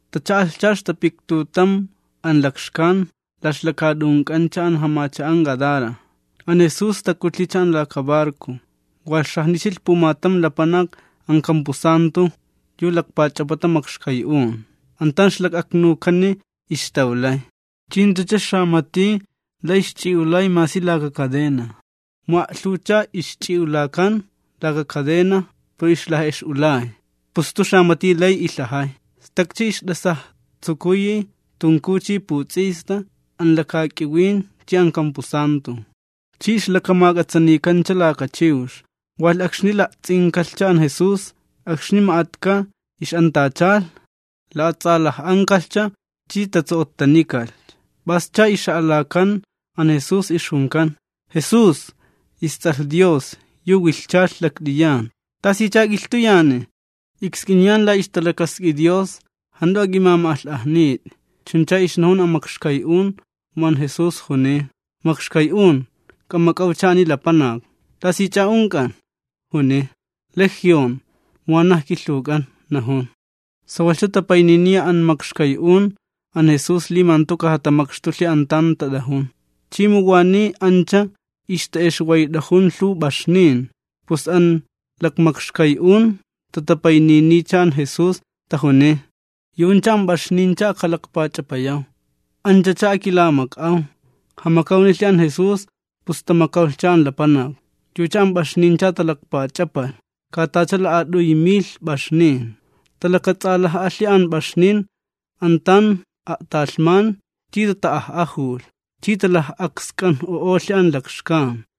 Tacha'alhcha ixtapiktutam an lakxkan la ixlakaat'unk'ancha an jamacha'an Gadara. An Jesús takutlhicha an laka barco. Walh xajnichilh pumatam lapanak an kampusantu yu lakpach'apata makxkay'un. An tan ixlak'aknukani ixtawlay, chi jantucha xamati lay ixch'i'ulay masi laka cadena. Mu a'lhuwchaa ixch'i'ulakan laka cadena pero ixlaj'ex'ulay, pus jantu xamati lay ilhajay. Stakcha ixt'asajtsukuyi tunkuw chi puts'ista an lakak'iwin chi an kampusantu. Chi ixlakamak'atsanikancha laka chiwx. Walh, akxni la'ts'inkalhcha an Jesús akxni ma'atka ix'antachalh, la'ats'alaj'ankalhcha chi tatso'ottanikalhcha. P'ascha ixa'alakan an Jesús, ixjunkan: ―¡Jesús, isTs'alh Dios yu wilhchalh talhman! ¿Tasicha k'ilhtuyani? Iksk'iniyan la ixtalakask'i Dios, jant'u ak'imama'alh'ajnit'i. Chuncha ixnajun an makxkay'un mu an Jesús juniy: ―¡Makxkay'un, k'amak'awcha ani lapanak! ¿T'asich'a unk'an? ―juniy. ―Legión, mu wanaj kilhuwk'an, ―najun. Sawalhcha tapayniniya an makxkay'un an Jesús li ma jantu kajatamakxtulhi an tan tat'ajun. Chi mu waniy ancha a'stitawk'a ixta'exwayt'ajun lhuw p'axnin, pus an lakmakxkay'un tatapaynisk'iniycha an Jesús, tajuniy: ―Yu'uncha an p'axnincha ajkalakpach'apayaw. Anchacha akilamak'aw. Jamakawnilhi an Jesús, pus tamakawlhcha an lapanak. Yucha an p'axnincha talakpach'apalh, ka tacha la'at'uy milh p'axnin. Talakats'alaj'alhi an p'axnin an tan a'talhman chi tata'aj'ajulh, chi talaj'aksk'anj'u'olh an lakxkan.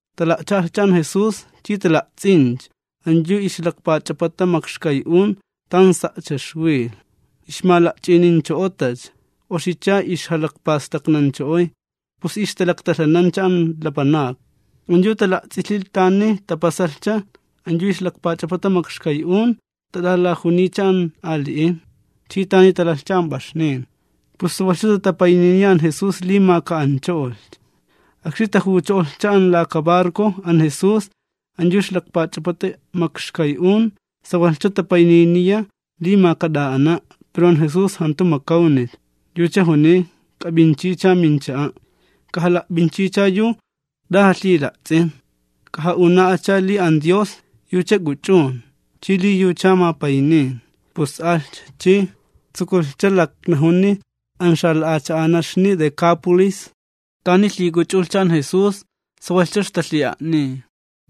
Tala'cha'alhcha an Jesús, chi tala'ts'incha an yu ixlakpach'apata makxkay'un tan sa'cha ixwilh, ixmala'ch'inincho'otacha, oxicha ixjalakpastaknancho'oy, pus ixtalaktalhanancha an lapanakni. An yu tala'ts'ilh tani tapasalhcha an yu ixlakpach'apata makxkay'un, ixtat'alajuniycha an ali'in, chi tani talalhcha an p'axnin. Pus tatapayninilhcha an Jesús li ma kataxtucho'olhcha. Akxni tajucho'olhcha an laka barco an Jesús, an yu ixlakpach'apata makxkay'un sawalhcha tapayniniya li ma kat'a'ana'. Pero an Jesús jantu makawnilh, yucha juniy: ―K'ap'inchicha mincha'a'. K'ajala'p'inchicha yu t'a jalhila'ts'in, k'aja'una'acha li an Dios yucha k'uch'un chi li yucha mapaynin. Pus alhcha, chi tsukulhcha laknajuni an xala'acha'anaxni Decápolis tani lhik'uch'ulhcha an Jesús. Sawalhcha ixtalhi'a'niy.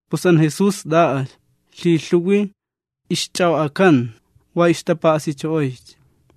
Pus an Jesús t'a'alh. Lhilhuwi ixch'a'o'akanta, wa ixtapa'asicho'oycha.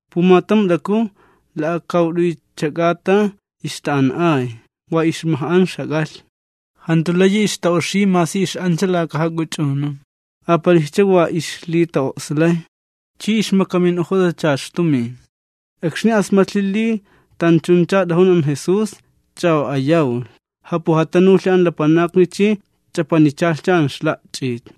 Pumatam t'aku la'akawt'uycha k'ata ixta'an'ay, wa ixmaj'an ixjak'alhni. Jantu layi ixta'oxiy masi ix'ancha laka jak'uch'unun, apalijcha wa ixlita'o'slay, chi ixmakamin'ojotacha ixtumin. Akxni asmatlhi li tanchuncha t'ajun an Jesús, ch'a'o'ayawlh, japujatanulhi an lapanakni chi ch'apanichalhi an ixla'ch'it.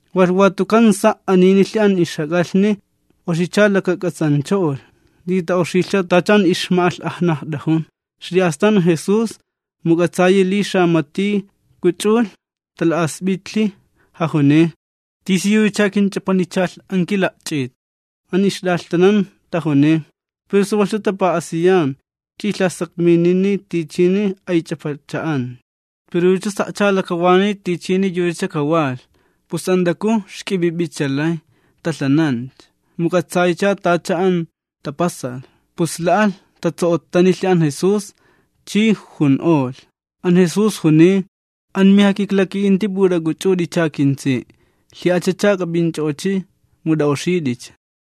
Walh watukan sa' aninilhi an ixjak'alhni, oxicha lakak'atsancho'olh li ta'oxilhcha tacha an ixma'alh'ajnajt'ajun. Xli'astan an Jesús mu k'atsayi li xamati k'uch'ulh, tala'asp'itlhi, jajuniy: ―¿Tisiyuchacha kinch'apanichalh an kila'ch'it? An ixt'alhtanan tajuniy: ―Pero sawalhcha tapa'asiyan ch'i lhasakminini tichini aych'apacha'ancha. Pero yucha sa'cha jalakawanani tichini yuchacha kawalh. Pus an t'aku xk'ip'ip'icha lay talhanancha, mu k'atsaycha tacha tapasalh, pus la'alh, tatso'ottanilhi an Jesús, chi jun'olh. An Jesús juniy: ―Amijakiklaka'inti p'ut'ak'uch'ut'icha, kintsi'. Lhi'ach'ach'a k'ap'inch'o'ochi', mu t'ak'uch'ut'icha.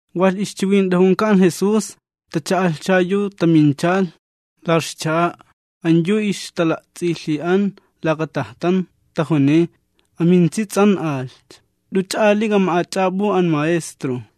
Walh ixchiwint'ajunka an Jesús, tacha'alhcha yu taminchalh la ixcha'a an yu ixla'ts'ilhi'an laka cha'a tan ixtata'ayxt'o'a an judiojnin, tajuniy: ―Amintsi nilhcha, jant'uch'a ali k'ama'ach'ap'u an Maestro.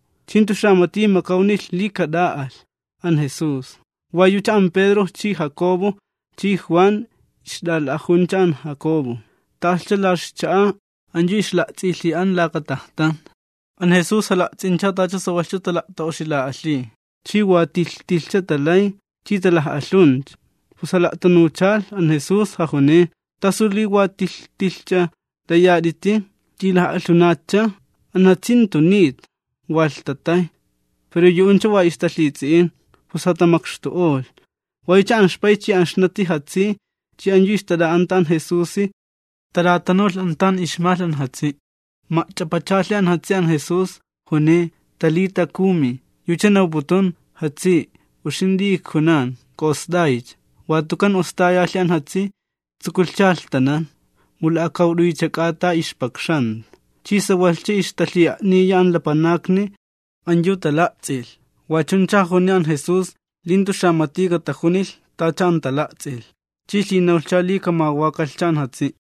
Chi jantu xamati makawnilh li kat'a'alh an Jesús, wa yucha an Pedro chi Jacobo chi Juan ixt'ala'ajuncha an Jacobo. Ta'alhcha la ixcha'a an yu ixla'ts'ilhi'an laka cha'a tan ixtata'ayxt'o'a an judiojnin. An Jesús jala'ts'incha tacha sawalhcha tala'ta'oxila'alhiy chi wa tilh tilhcha ixtalay chi ixtalaj'alhuncha. Pus jala'tanuchalh an Jesús, jajuniy: ―¿T'asu li wa t'ilh tilhch'a layat'iti ch'i laj'alhunatcha? An jatsi jantu nita, wa lhtatay. Pero yu'uncha wa ixtalhits'i'in. Pus jatamakxtu'olh, wa yucha an ixpay chi an ixnati jatsi chi an yu ixtat'a'anta an Jesusi tat'atanulh an tan ixmalh an jatsi'. Ma'ch'apachalhi an jatsi an Jesús, juniy: ―Talita, kumi ―yucha nawputun: Jatsi', uxint'i ijkunan, ¡k'a'ost'aycha! Watukan ostayalhi an jatsi, tsukulhcha jalhtanan. Mu la'akawt'uycha k'ata ixpakxanta. Chi sawalhcha ixtalhi'a'niya an lapanakni an yu tala'ts'ilh. Wachuncha jajuniy an Jesús li jantu xamati katajunilh tacha an tala'ts'ilh, chi lhinawlhcha li kamawakalhcha an jatsi'.